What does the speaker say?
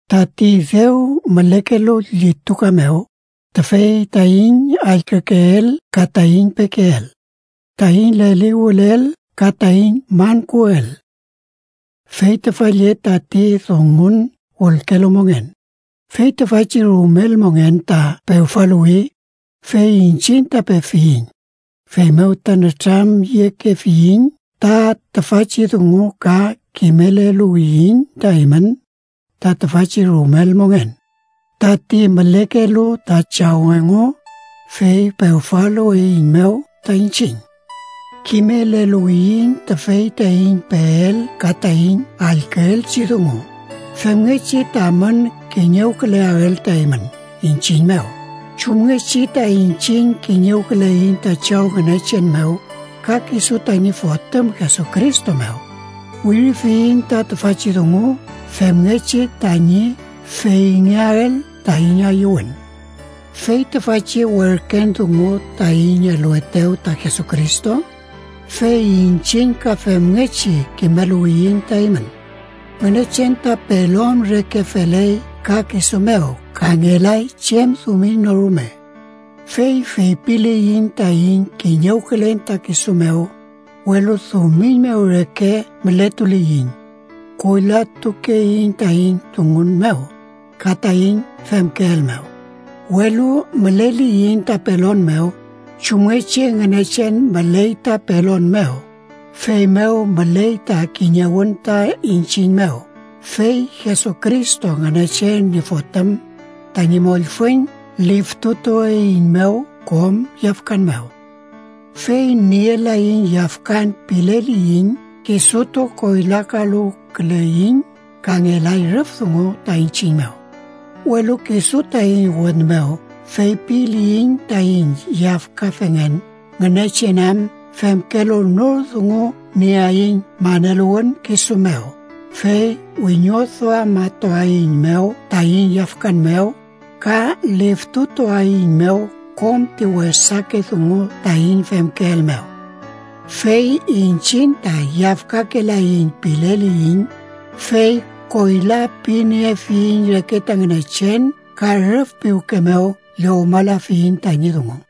Tati dew mülekelu llituka mew, tüfey taiñ allkükeel ka taiñ pekeel. Taiñ leliwülel ka taiñ mankuwüel. Fey tüfa lle tati Dungun wülkelu mongen. Fey tüfachi rumel mongen ta pewfaluwi, fey iñchiñ ta pefiyiñ. Feymew ta nütramyekefiyiñ ta tüfachi dungu ka kimeleluwiyiñ ta eymün ta tüfachi rumel mongen, tati mülekelu ta Chaw engu, fey pewfaluweiñmew ta iñchiñ. Kimeleluwiyiñ tüfey taiñ peel ka taiñ allküelchi dungu femngechi tamün kiñewküleael ta eymün iñchiñ mew, chumngechi ta iñchiñ kiñewküleiñ ta Chaw Ngünechen mew ka kisu tañi Fotüm Jesucristo mew. Wirifiyiñ ta tüfachi dungu femngechi tañi feyngeael taiñ ayüwün. Fey tüfachi werken dungu taiñ eluetew ta Jesucristo, fey iñchiñ ka femngechi kimeluwiyiñ ta eymün: Ngünechen ta pelon reke feley ka kisu mew ta ngelay chem dumiñ no rume. Fey feypiliyiñ taiñ kiñewkülen ta kisu mew, welu dumiñ mew reke mületuliyiñ, koylatukeiñ taiñ dungun mew ka taiñ femkeel mew. Welu müleliyiñ ta pelon mew, chumngechi Ngünechen müley ta pelon mew, feymew müley ta kiñewün ta iñchiñ mew, fey Jesucristo, Ngünechen ñi Fotüm, tañi mollfüñ liftutueiñmew kom yafkan mew. Fey nielaiñ yafkan pileliyiñ, kisutu koylakaluwküleyiñ ka ngelay rüf dungu ta iñchiñ mew. Welu kisu taiñ wün mew feypiliyiñ taiñ yafkafengen, Ngünechen am femkelu nor dungu nieaiñ maneluwün kisu mew, fey wiñoduamatuaeiñmew taiñ yafkan mew ka liftutuaeiñmew kom ti wesake dungu taiñ femkeel mew. Fey iñchiñ ta yafkakelaiñ pileliyiñ, fey koyla piniefiyiñ reke ta Ngünechen ka rüf piwke mew llowmalafiyiñ tañi dungu.